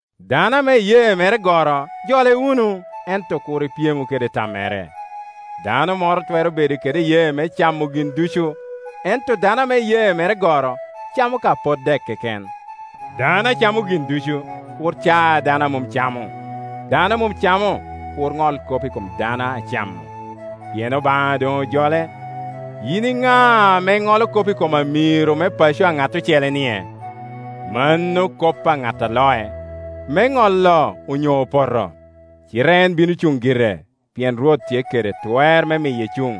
Dano ame iyee mere goro jole wunu, ento kur ipyemu kede tammere. Dano moro twero bedo kede iyee me camo gin ducu, ento dano ame iyee mere goro camo ka pot dek keken. Dano a camo gin ducu kur ca dano a mom camo, dano a mom camo kur ŋol kop i kom dano a camo; pien Obaŋa doŋ ojole. Yin i ŋa ame iŋolo kop i kom amiro me paco a ŋat ocele-nie? Mano kop a ŋat a loc, me ŋolo onyo opoto. Cite en bino cuŋ gire, pien Rwot tye kede twer me miye cuŋ.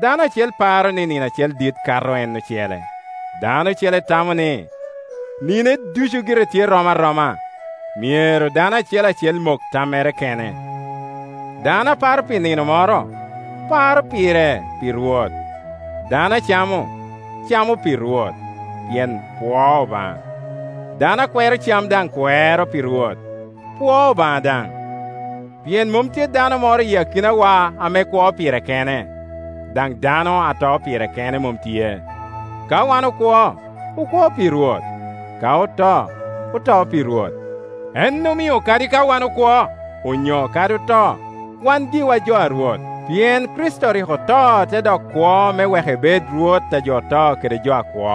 Dano acel paro ni nino acel dit kato en ocele, dano ocele tamo ni nine ducu gire tye rom aroma. Myero dano acel acel mok tammere kene. Dano a paro pi nino moro, paro pire pi Rwot; dano a camo, camo pi Rwot, pien pwoo Obaŋa; dano a kwero cam daŋ kwero pi Rwot, pwoo Obaŋa daŋ. Pien mom tye dano moro i akinawa ame kwo pire kene, daŋ dano a to pire kene mom tye. Ka wan okwo, okwo pi Rwot; ka oto, oto pi Rwot. En omio kadi ka wan okwo, onyo kadi oto, wan giwa jo a Rwot. Pien Kricito rik oto te dok kwo me wek ebed Rwot a jo oto kede jo akwo.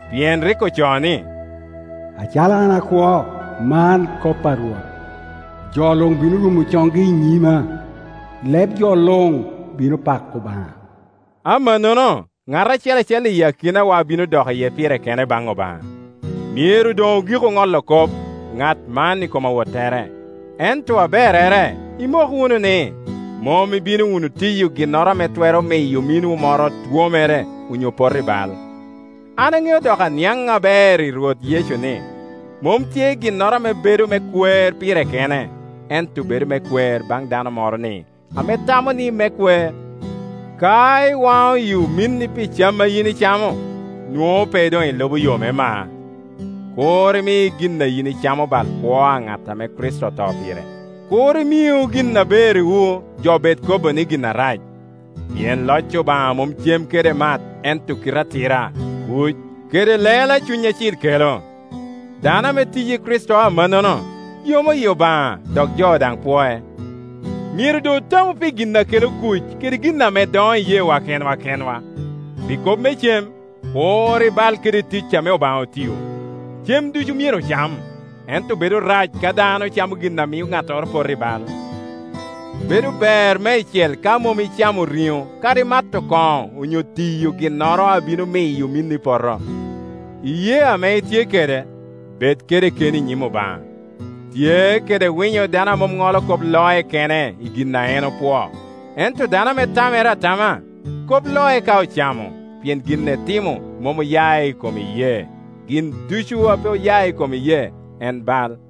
Pien rik ocoo ni, “Acalo an akwo, man kop a Rwot, jo luŋ bino rumo coŋgi i nyima, leb jo luŋ bino pako Obaŋa.” Amannono ŋat acel acel i akinawa bino dok iye pire kene baŋ Obaŋa. Myero doŋ ogiku ŋolo kop ŋat man i kom awottere; ento aberrere imok wunu ni, mom ibino wunu tiyo ginnoro ame twero miyo ominwu moro twomere onyo poto i bal. An aŋeo dok aniaŋ aber i Rwot Yecu ni, mom tye ginnoro ame bedo me kwer pire kene; ento bedo me kwer baŋ dano moro-ni ame tamo ni me kwer. Ka iwaŋo yi ominni pi cam a yin icamo, nwoŋo pe doŋ ilubo yo me mar. Kur imi gin a yin icamo bal kwo a ŋat ame Kricito oto pire. Kur imiu gin aberriwu, jo bed kobo ni gin arac. Pien loc Obaŋa mom cem kede mat, ento kite atira, kuc, kede lelo a Cuny Acil kelo. Dano ame tiyi Kricito amannono yomo yi Obaŋa, dok jo daŋ pwoe. Myero doŋ otamu pi gin a kelo kuc kede gin ame doŋo iyeewa kenwa kenwa. Pi kop me cem kur ibal kede tic ame Obaŋa otio. Cem ducu myero ocam, ento bedo rac ka dano camo gin a mio ŋattoro poto i bal. Bedo ber meicel ka mom icamo riŋo kadi mato koŋo onyo tiyo ginnoro a bino miyo ominni poto. Iyee ame itye kede, bed kede keni i nyim Obaŋa. Tye kede winyo dano a mom ŋolo kop loc kene i gin a en opwoo. Ento dano ame tamere atama, kop loc ka ocamo, pien gin etimo mom oya i kom iyee; gin ducu a pe oya i kom iyee, en bal.